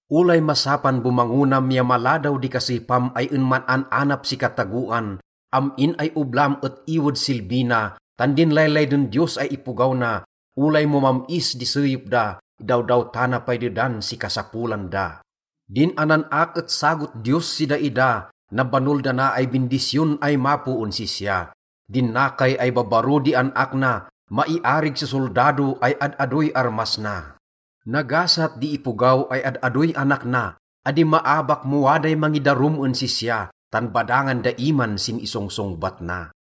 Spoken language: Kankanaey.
Olay masapan bomangonam ya maladaw di kaseypam ay en man-an-anap si katagoan, am-in ay oblam et iwed silbi na, tan din laylayden Diyos ay ipogaw na, olay mo mam-is di seyep da, idawdawtana pay dedan si kasapolan da. Din anan-ak et sagot Diyos si daida, nabanol dana ay bindisyon ay mapo en sisya. Din nakay ay babbaro di an-ak na, maiarig si soldado ay ad-adoy armas na. Nagasat di ipogaw ay ad-adoy anak na. Adi maabak mo waday mangidarum en sisya, tan badangan da iman sin isongsongbat na.